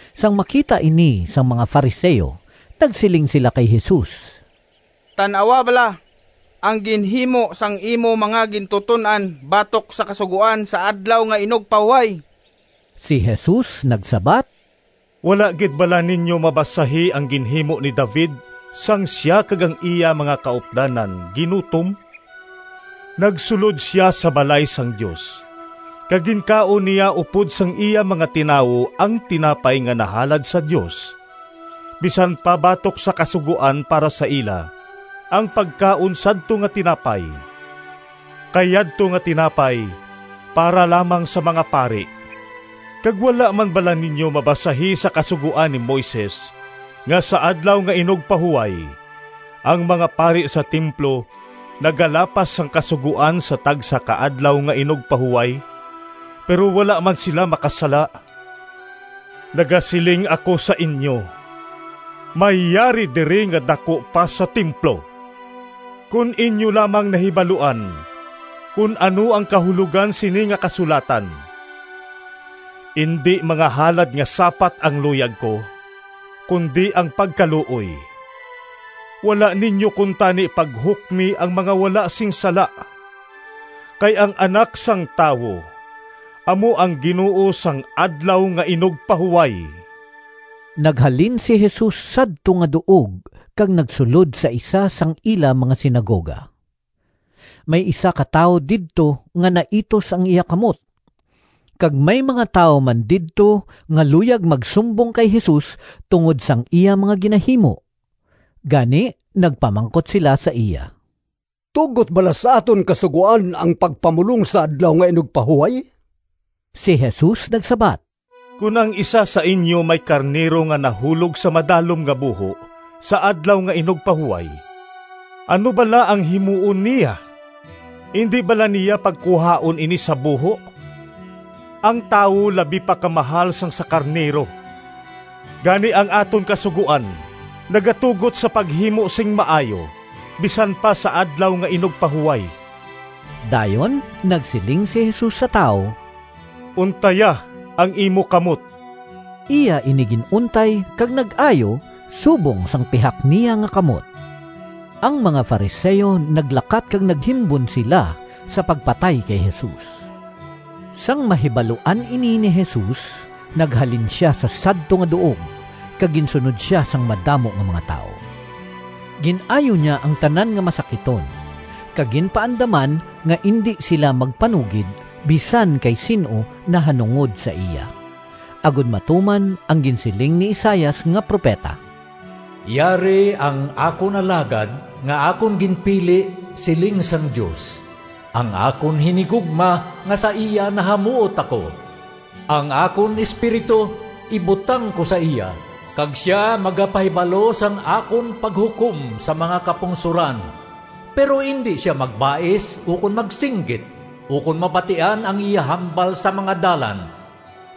Sang makita ini sang mga Fariseo nagsiling sila kay Jesus, “Tan-awa bala, ang ginhimo sang imo mga gintuton-an batok sa Kasugoan sa Adlaw nga Inugpahuway!” Si Jesus nagsabat, “Wala gid bala ninyo mabasahi ang ginhimo ni David sang sia kag ang iya mga kaupdanan ginutom? Nagsulod sia sa balay sang Dios, kag ginkaon niya upod sang iya mga tinawo ang tinapay nga nahalad sa Dios, bisan pa batok sa Kasugoan para sa ila ang pagkaon sadto nga tinapay. Kay yadto nga tinapay para lamang sa mga pari. Kag wala man bala ninyo mabasahi sa Kasugoan ni Moises nga sa Adlaw nga Inugpahuway, ang mga pari sa templo nagalapas sang Kasugoan sa tagsa ka Adlaw nga Inugpahuway, pero wala man sila makasala? Nagasiling ako sa inyo, may yari diri nga daku pa sa templo. Kon inyo lamang nahibaluan kon ano ang kahulogan sini nga kasulatan, ‘Indi mga halad nga sapat ang luyag ko, kundi ang pagkaluoy,’ wala ninyo kuntani paghukmi ang mga wala sing sala. Kay ang Anak sang Tawo amo ang Ginoo sang Adlaw nga Inugpahuway.” Naghalin si Jesus sadto nga duog kag nagsulod sa isa sang ila mga sinagoga. May isa ka tawo didto nga naitus ang iya kamot, kag may mga tawo man didto nga luyag magsumbong kay Jesus tungod sang iya mga ginahimo. Gani nagpamangkot sila sa iya, “Tugot bala sa aton Kasugoan ang pagpamulong sa Adlaw nga Inugpahuway?” Si Jesus nagsabat, “Kon ang isa sa inyo may karnero nga nahulog sa madalom nga buho sa Adlaw nga Inugpahuway, ano bala ang himuon niya? Indi bala niya pagkuhaon ini sa buho? Ang tawo labi pa ka mahal sang sa Karnero! Gani ang aton Kasugoan nagatugot sa paghimo sing maayo bisan pa sa Adlaw nga Inugpahuway.” Dayon nagsiling si Jesus sa tawo, “Untaya ang imo kamot.” Iya ini gin-untay kag nag-ayo subong sang pihak niya nga kamot. Ang mga Fariseo naglakat kag naghimbon sila sa pagpatay kay Jesus. Sang mahibaluan ini ni Jesus, naghalin sia sa sadto nga duog kag ginsunod sia sang madamo nga mga tawo. Gin-ayo niya ang tanan nga masakiton, kag ginpaandaman nga indi sila magpanugid bisan kay sin-o nahanungod sa iya, agod matuman ang ginsiling ni Isaias nga propeta: “Yari ang akon alagad Nga akon ginpili, Siling sang Dios, Ang akon hinigugma Nga sa iya nahamuot ako. Ang akon espiritu ibutang ko sa iya, Kag sia magapahibalo Sang akon paghukom Sa mga kapungsoran. Pero indi sia magbais Ukon magsinggit, Ukon mabatian ang iya hambal Sa mga dalan.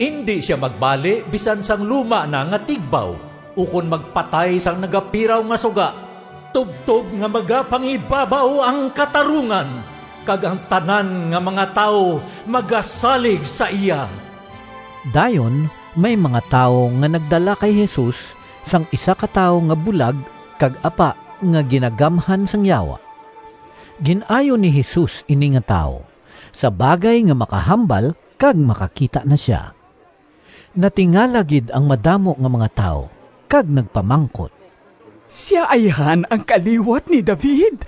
Indi sia magbali Bisan sang luma na nga tigbaw, Ukon magpatay sang nagapiraw nga suga, Tubtob nga magapangibabaw Ang katarungan, Kag ang tanan nga mga tawo Magasalig sa iya.” Dayon may mga tawo nga nagdala kay Jesus sang isa ka tawo nga bulag kag apa nga ginagamhan sang yawa. Gin-ayo ni Jesus ini nga tawo, sa bagay nga makahambal kag makakita na sia. Natingala gid ang madamo nga mga tawo kag nagpamangkot, “Sia ayhan ang kaliwat ni David?”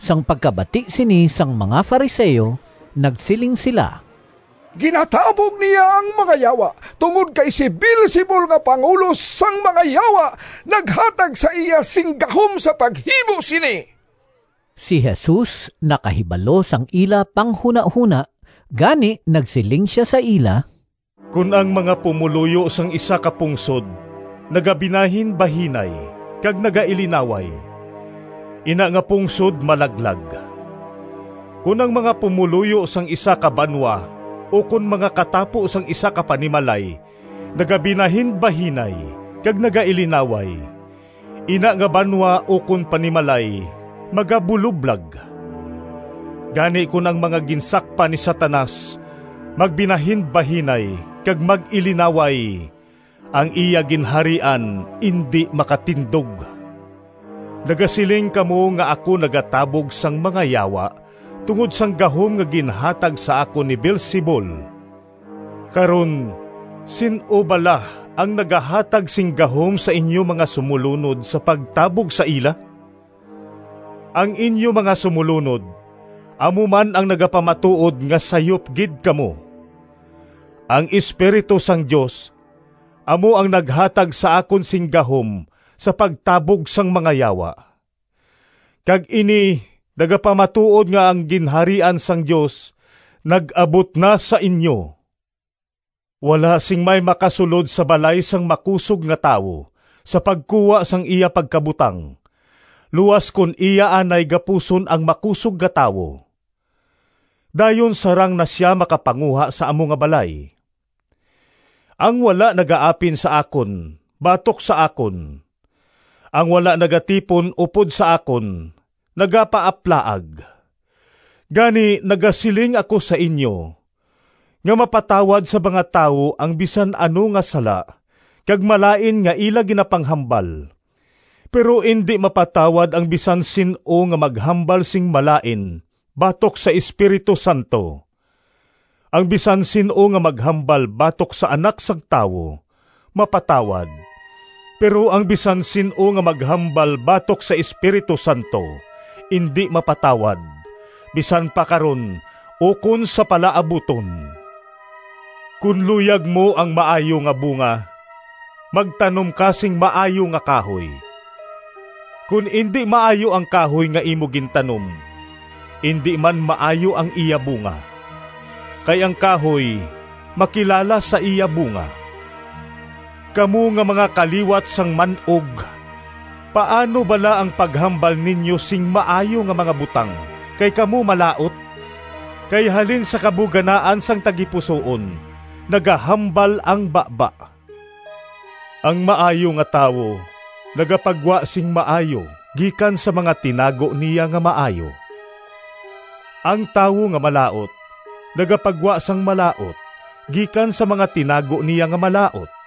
Sang pagkabati sini sang mga Fariseo nagsiling sila, “Ginatabog niya ang mga yawa tungod kay si Beelzebul nga pangulo sang mga yawa naghatag sa iya sing gahom sa paghimo sini.” Si Jesus nakahibalo sang ila panghunahona, gani nagsiling sia sa ila, “Kon ang mga pumoluyo sang isa ka pungsod nagabinahinbahinay kag nagailinaway, ina nga pungsod malaglag. Kon ang mga pumoluyo sang isa ka banwa ukon mga katapo sang isa ka panimalay nagabinahinbahinay kag nagailinaway, ina nga banwa ukon panimalay magabuloblag. Gani kon ang mga ginsakpan ni Satanas magbinahinbahinay kag mag-ilinaway, ang iya ginharian indi makatindog! Nagasiling kamo nga ako nagatabog sang mga yawa tungod sang gahom nga ginhatag sa akon ni Beelzebul. Karon sin-o bala ang nagahatag sing gahom sa inyo mga sumolunod sa pagtabog sa ila? Ang inyo mga sumolunod amo man ang nagapamatuod nga sayop gid kamo! Ang Espiritu sang Dios amo ang naghatag sa akon sing gahom sa pagtabog sang mga yawa, kag ini nagapamatuod nga ang Ginharian sang Dios nag-abot na sa inyo. “Wala sing may makasulod sa balay sang makusog nga tawo sa pagkuha sang iya pagkabutang luas kon iya anay gapuson ang makusog nga tawo; dayon sarang na sia makapanguha sa amo nga balay. “Ang wala nagaapin sa akon batok sa akon; ang wala nagatipon upod sa akon nagapaaplaag. Gani, nagasiling ako sa inyo nga mapatawad sa mga tawo ang bisan ano nga sala kag malain nga ila ginapanghambal, pero indi mapatawad ang bisan sin-o nga maghambal sing malain batok sa Espiritu Santo. Ang bisan sin-o nga maghambal batok sa Anak sang Tawo mapatawad, pero ang bisan sin-o nga maghambal batok sa Espiritu Santo indi mapatawad, bisan pa karon ukon sa palaabuton.” “Kon luyag mo ang maayo nga bunga, magtanom ka sing maayo nga kahoy; kon indi maayo ang kahoy nga imo gintanom indi man maayo ang iya bunga. Kay ang kahoy makilala sa iya bunga. Kamo nga mga kaliwat sang man-og, paano bala ang paghambal ninyo sing maayo nga mga butang, kay kamo malaut? Kay halin sa kabuganaan sang tagipusoon nagahambal ang baba. Ang maayo nga tawo nagapagwa sing maayo gikan sa mga tinago niya nga maayo; ang tawo nga malaut nagapagwa sang malaut gikan sa mga tinago niya nga malaut.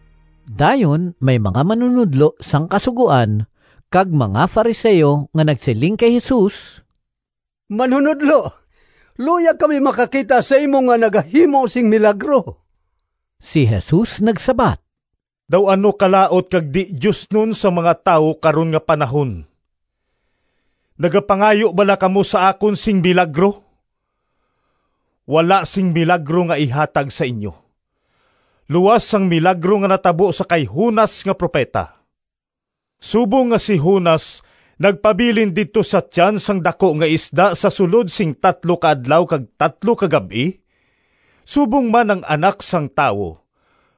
Dayon may mga manunodlo sang Kasugoan kag mga Fariseo nga nagsiling kay Jesus, “Manunodlo, luyag kami makakita sa imo nga nagahimo sing milagro.” Si Jesus nagsabat, “Daw ano kalaut kag di-diosnon sang mga tawo karon nga panahon! Nagapangayo bala kamo sa akon sing milagro? Wala sing milagro nga ihatag sa inyo luas sang milagro nga natabo sa kay Jonas nga propeta. Subong nga si Jonas nagpabilin didto sa tiyan sang daku nga isda sa sulod sing tatlo ka adlaw kag tatlo ka gab-i, subong man ang Anak sang Tawo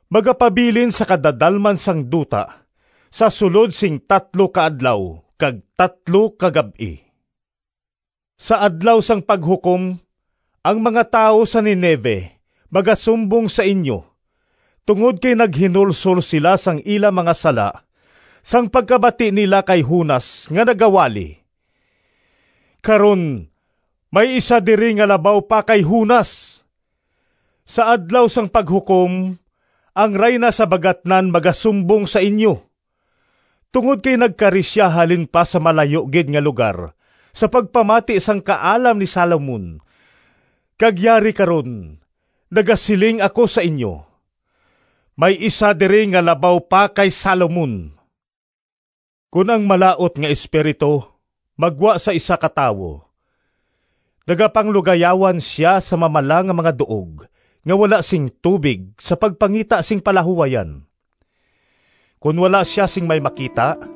magapabilin sa kadadalman sang duta sa sulod sing tatlo ka adlaw kag tatlo ka gab-i. Sa Adlaw sang Paghukom ang mga tawo sa Ninive magasumbong sa inyo tungod kay naghinulsol sila sang ila mga sala sang pagkabati nila kay Jonas nga nagawali. Karon may isa diri nga labaw pa kay Jonas! Sa Adlaw sang Paghukom ang Rayna sa Bagatnan magasumbong sa inyo, tungod kay nagkari sia halin pa sa malayo gid nga lugar sa pagpamati sang kaalam ni Salomon kag yari karon nagasiling ako sa inyo, may isa diri nga labaw pa kay Salomon!” “Kon ang malaut nga espiritu maggwa sa isa ka tawo, nagapanglugayawan sia sa mamala nga mga duog nga wala sing tubig sa pagpangita sing palahuwayan. Kon wala sia sing may makita,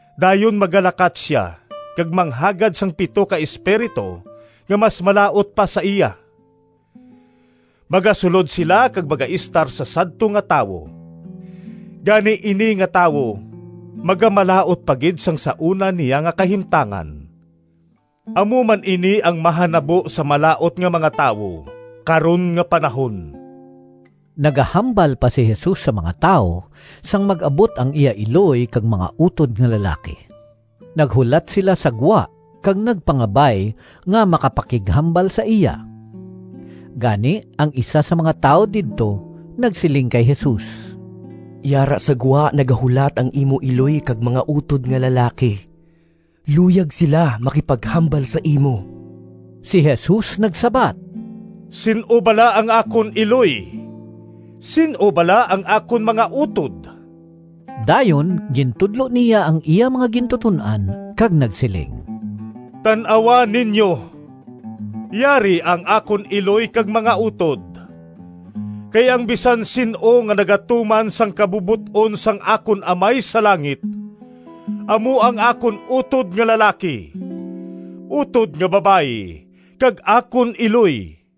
Dayon magalakat sia kag manghagad sang pito ka espiritu nga mas malaut pa sa iya. Magasulod sila kag magaestar sa sadto nga tawo. Gani, ini nga tawo magamalaut pa gid sang sa una niya nga kahimtangan. Amo man ini ang mahanabo sa malaut nga mga tawo karon nga panahon.” Nagahambal pa si Jesus sa mga tawo, sang mag-abot ang iya iloy kag mga utod nga lalaki. Naghulat sila sa gwa kag nagpangabay nga makapakighambal sa iya. Gani ang isa sa mga tawo didto nagsiling kay Jesus, “Yara sa gwa nagahulat ang imo iloy kag mga utod nga lalaki. Luyag sila magpakighambal sa imo.” Si Jesus nagsabat, “Sin-o bala ang akon iloy? Sin-o bala ang akon mga utod?” Dayon gintudlo niya ang iya mga gintuton-an kag nagsiling, “Tan-awa ninyo, yari ang akon iloy kag mga utod. Kay ang bisan sin-o nga nagatuman sang kabubot-on sang akon Amay sa langit amo ang akon utod nga lalaki, utod nga babayi, kag akon iloy.”